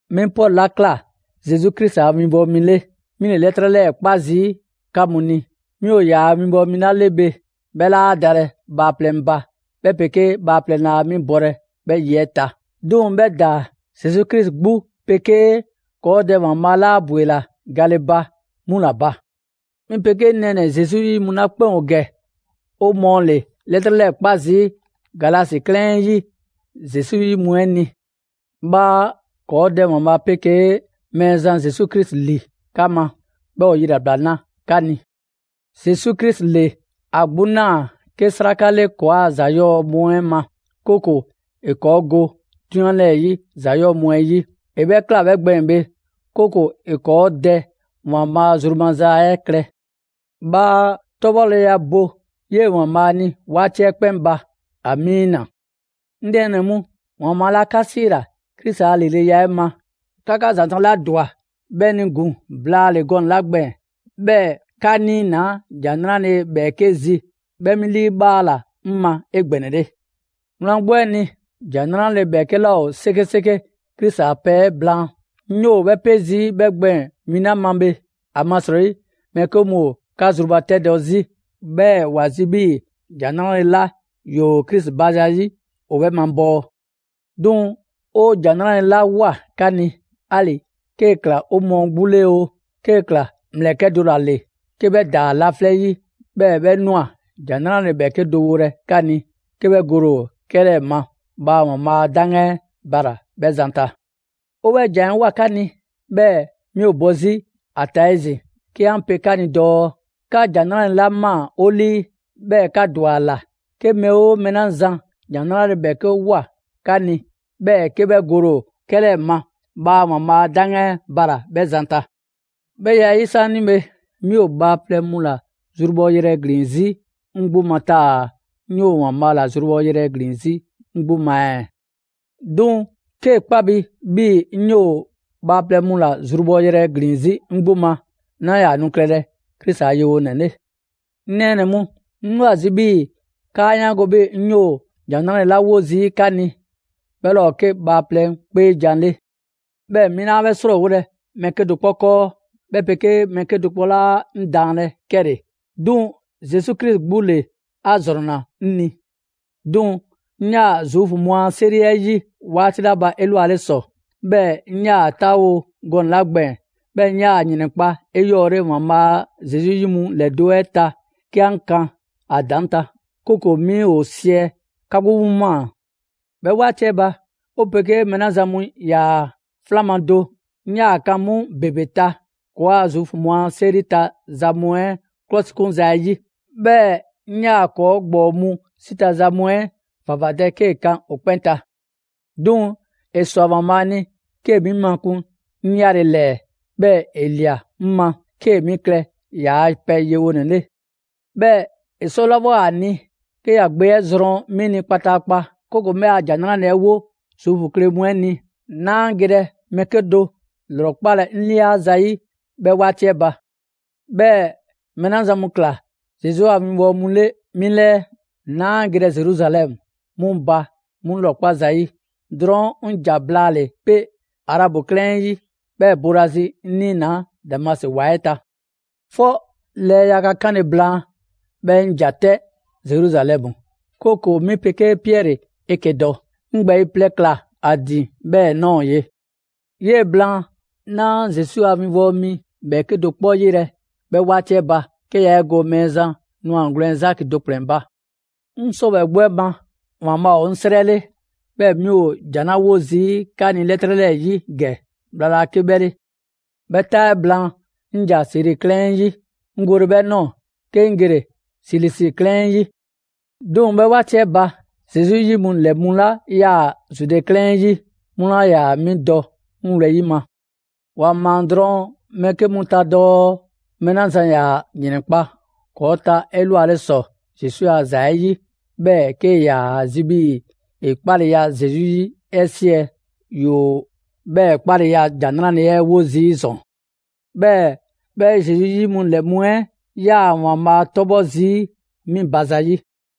'Mi Pɔlu 'la ꞊kla Zesu Krisi a winbɔwo mi 'le, mi ‑le 'lɛtrɛ 'lɛɛ‑ 'kpa zii' 'ka mu ni. 'Mi ‑o ‑yaa' winbɔwo mi 'la 'le bhe, 'bhɛ 'laa dalɛ bhaaplɛŋ ba, 'bhɛ 'pegee bhaaplɛŋ laa 'mi bɔlɛ 'bhɛ ye 'ɛ ta. 'Duŋ‑ 'bhɛ ‑daa Zesu Krisi 'gbu 'pegee ‑kɔɔ' Dɛ ‑Waanbhaa' 'la 'a ‑bwela gale 'mu ‑la ba. 'Mi 'pegee 'ŋ nɛɛnɛ‑ Zesu 'yi mu 'la 'kpɛn ‑o ‑gɛ, 'o mɔɔ ‑le 'lɛtrɛ 'lɛɛ 'kpa zii' Galasi 'klɛɛn 'ɛ 'yi Zesu 'yi mu 'ɛ ni. Bhaa ‑kɔɔ' Dɛ ‑Waanbhaa' 'pegee Mɛɛzan Zesu Krisi ‑li 'ka ma, 'bhɛɛ‑ ‑o yilabla 'na 'ka ni. Zesu Krisi ‑le ‑a 'gbu ꞊naa 'ke 'sraka 'le ‑kɔɔa' ‑za 'yɔɔ‑ mu 'ɛ ma, 'kooko‑ ‑e ‑kɔɔ' go 'drunyan 'lɛɛ‑ 'yi za ‑yɔɔ' mu 'ɛ 'yi. ‑E 'bhɛ ꞊kla 'bhɛ gbɛɛn‑ bhe, 'kooko‑ ‑e ‑kɔɔ' Dɛ ‑Waanbhaa' zru maza 'ɛ klɛ. Bhaa 'tɔbhɔleya bo 'yee‑ ‑Waanbhaa' ni 'waati 'ɛ 'kpɛn ba! Amiina! 'Ŋ nɛɛnɛ‑ mu, ‑Waanbhaa' 'la 'ka 'siila‑ Krisi a lileya 'ɛ ma, 'ka 'ka ‑zanta' 'la ‑dwa 'bhɛ ni ‑gun blaale‑ gɔnɛ‑ 'la gbɛɛn‑, 'bhɛɛ‑ 'ka 'niinaa ‑Jan 'Nrale‑ ‑bhɛɛke' zi, 'bhɛ 'mi 'liibhaala 'ŋ ma 'egbɛnɛle. Wlan 'gbu 'ɛ ni, ‑Jan 'Nrale‑ 'bhɛɛke 'laa ‑o 'sekeseke Krisi a pɛ 'ɛ blaan. 'Ŋ 'yoo‑ 'bhɛ 'pe zii' 'bhɛ gbɛɛn‑ win 'la ma bhe, ‑amasrɔyi mɛɛ 'ke mu ‑o 'ka zrubatɛdɔ 'zi. 'Bhɛɛ‑ ‑wa zi 'bhii‑ ‑Jan 'Nrale‑ 'la ‑yoo Krisi ba zayi' ‑o 'bhɛ mabɔɔ. 'Duŋ‑ 'o ‑Jan 'Nrale‑ 'la ꞊woa 'ka ni, 'ali‑ 'kee‑ ꞊kla 'o mɔɔ 'gbu 'le oo, 'kee‑ ꞊kla ‑mlɛkɛ' do ‑la ‑le 'ke 'bhɛ ‑daa laflɛ' 'yi, 'bhɛɛ‑ 'bhɛ ꞊nwa ‑Jan 'Nrale‑ ‑bhɛɛke' do wolɛ 'ka ni 'ke 'bhɛ gole ‑o 'kɛlɛɛ‑ ma, bhaa ‑Waanbhaa' a 'daŋgan 'ɛ bala‑ 'bhɛ zan ta. 'O 'bhɛ ‑jan 'ɛ ꞊woa 'ka ni, 'bhɛɛ‑ 'mi ‑o bɔ 'zi ‑a ta 'ezin‑ 'ke 'an pe 'ka ni dɔɔ: 'Ka ‑Jan 'Nrale‑ 'la ꞊maa 'o 'lii, 'bhɛɛ‑ 'ka ‑dwa ‑a ‑la, 'ke mɛɛ 'oo mɛɛ 'la zan ‑Jan 'Nrale‑ ‑bhɛɛke' ꞊woa 'ka ni, 'bhɛɛ‑ 'ke 'bhɛ gole ‑o 'kɛlɛɛ‑ ma, bhaa ‑Waanbhaa' a 'daŋgan bala‑ 'bhɛ zan ta. 'Bhɛ ya 'ɛ 'yi 'saanibhe, 'mi ‑o bhaaplɛŋ mu ‑la zrubhɔ yrɛ ‑glin 'zi 'ŋ 'gbu ma taa‑ 'ŋ 'yoo‑ ‑Waanbhaa' ‑la zrubhɔ yrɛ ‑glin 'zi 'ŋ 'gbu ma ɛɛ? 'Duŋ‑ 'kee‑ 'kpa bi 'bhii‑ 'ŋ 'yoo‑ ‑o bhaaplɛŋ mu ‑la zrubhɔ yrɛ ‑glin 'zi 'ŋ 'gbu ma, 'naa ‑yaa nu klɛlɛ Krisi a yewonɛ 'le. 'Ŋ nɛɛnɛ‑ mu, 'ŋ 'yoo‑ ‑a zi' 'bhii‑ 'kaa 'yaango‑ 'bhii‑ 'ŋ 'yoo‑ ‑Jan 'Nrale‑ 'la 'wo zii' 'ka ni, 'bhɛ 'laa ‑o 'ke bhaaplɛŋ 'kpeejan‑ 'le. 'Bhɛɛ‑ 'mi 'laa 'bhɛ 'srɔɔwolɛ mɛɛ 'kedo‑ 'kpɔ 'kɔɔ, 'bhɛ 'pegee mɛɛ 'kedo‑ 'laa 'ŋ daanlɛ 'kɛle‑. 'Duŋ‑ Zesu Krisi 'gbu ‑le 'a ‑zrɔnna 'ŋ ni. 'Duŋ‑ 'ŋ 'yaa‑ Zuufu mu a 'seri 'ɛ 'yi 'waati 'la ba 'elwale ‑sɔ, 'bhɛɛ‑ 'ŋ 'yaa‑ 'taawo‑ gɔnɛ‑ 'la gbɛɛn‑, 'bhɛɛ‑ 'ŋ 'yaa‑ ‑yrɛnkpa' 'eyɔɔle ‑Waanbhaa' a Zesu 'yi mu ‑lɛdo' 'ɛ ta 'ke 'an kan ‑a ‑daŋ' ta, 'kooko‑ 'mi ‑o 'siɛ‑, 'ka 'gbu 'mu ꞊maa. 'Bhɛ 'waati 'ɛ ba, 'o 'pegee mɛɛ 'la zan mu ‑yaa 'flan ma do, 'ŋ 'yaa‑ 'kan 'mu ‑bebe ta ‑kɔɔa' Zuufu mu a 'seri ta za mu 'ɛ ‑klɔsikunza 'ɛ 'yi. 'Bhɛɛ‑ 'ŋ 'yaa‑ ‑kɔɔ' ‑gbɔɔ mu 'si ta za mu 'ɛ ‑vavadɛ 'kee‑ 'kan ‑o 'kpɛn ta. 'Duŋ‑ ‑e ꞊swa ‑Waanbhaa' ni 'kee‑ 'mi makun 'ŋ 'yale‑ ‑lɛɛ, 'bhɛɛ‑ ‑e ꞊lia 'mi ma 'kee‑ 'mi klɛ ‑yaa' pɛ yewonɛ 'le. 'Bhɛɛ‑ ‑e 'sɔlawoa ‑a ni 'ke ‑ya gbe 'ɛ zrɔn 'mi ni kpataakpa, 'kooko‑ 'ŋ 'bhɛ 'a ‑Jan 'Nrale‑ 'ɛ 'wo Zuufu kle mu 'ɛ ni, 'naa gelɛ mɛɛ 'kedo‑ 'lrɔkpalɛ 'ŋ ꞊lia zayi' 'bhɛ 'waati 'ɛ ba. 'Bhɛɛ‑ mɛɛ 'la zan mu ꞊kla Zesu a winbɔwo mu 'le 'mi 'lɛɛ, 'naa gelɛ Zeruzalɛmu 'mu ba 'mu 'lrɔkpa zayi'. Drɔɔn' 'ŋ ‑ja blaale 'pe Arabu 'klɛɛn 'ɛ 'yi, 'bhɛɛ‑ boolazi 'ŋ 'niinaa‑ Damasi ‑wa 'ɛ ta. 'Fɔ lɛɛ yaga 'kanle‑ blaan, 'bhɛɛ‑ 'ŋ ‑ja 'tɛ Zeruzalɛmu, 'kooko‑ 'mi 'pegee Piɛri 'eke‑ dɔ. 'Ŋ ‑gbɛɛyi' plɛ ‑kla ‑a ‑din 'bhɛ ꞊nɔɔ ye. 'Yee‑ blaan, 'naa Zesu a 'winbɔwo mi 'bhɛɛke do 'kpɔ 'yelɛ‑ 'bhɛ 'waati 'ɛ ba, 'ke yaa 'e go Mɛɛzan ‑nwagwlɛn' Zaki do ‑kplɛn ba. 'Ŋ 'sɔwɛɛ‑ 'gbu 'ɛ ma, ‑Waanbhaa' ‑o 'ŋ 'srɛ 'le, 'bhɛɛ‑ 'mi ‑o ‑jan 'la 'wo zii' 'ka ni 'lɛtrɛ 'lɛɛ‑ 'yi ‑gɛ, bhla laa 'ke 'bhɛ 'le. 'Bhɛ 'taa 'ɛ blaan, 'ŋ ‑ja Siri 'klɛɛn 'ɛ 'yi, 'ŋ gole 'bhɛ ꞊nɔɔ, 'ke 'ŋ gele‑ Silisi 'klɛɛn 'ɛ 'yi. 'Duŋ‑ 'bhɛ 'waati 'ɛ ba, Zesu 'yi mu ‑lɛ mu 'la 'yaa‑ Zude 'klɛɛn 'ɛ 'yi, 'mu 'laa ‑yaa 'mi dɔ 'ŋ wlɛyi' ma. ‑Wa ꞊maa drɔŋ mɛɛ 'ke mu ta dɔɔ: «Mɛɛ 'la zan ‑yaa ‑yrɛnkpa' ‑kɔɔ' ta 'elwale ‑sɔ Zesu a ‑za 'ɛ 'yi, 'bhɛɛ‑ ‑e 'kee‑ ‑yaa zi' 'bhii‑ ‑e 'kpaleya Zesu 'yi 'ɛ siɛ, ‑yoo 'bhɛɛ‑ 'kpaleya ‑Jan 'Nrale‑ 'ɛ 'wo zii' ‑zɔn.» 'Bhɛɛ‑ 'bhɛ Zesu 'yi mu ‑lɛ mu 'ɛ 'yaa‑ ‑Waanbhaa' 'tɔbhɔ‑ zii' 'mi ba zayi'.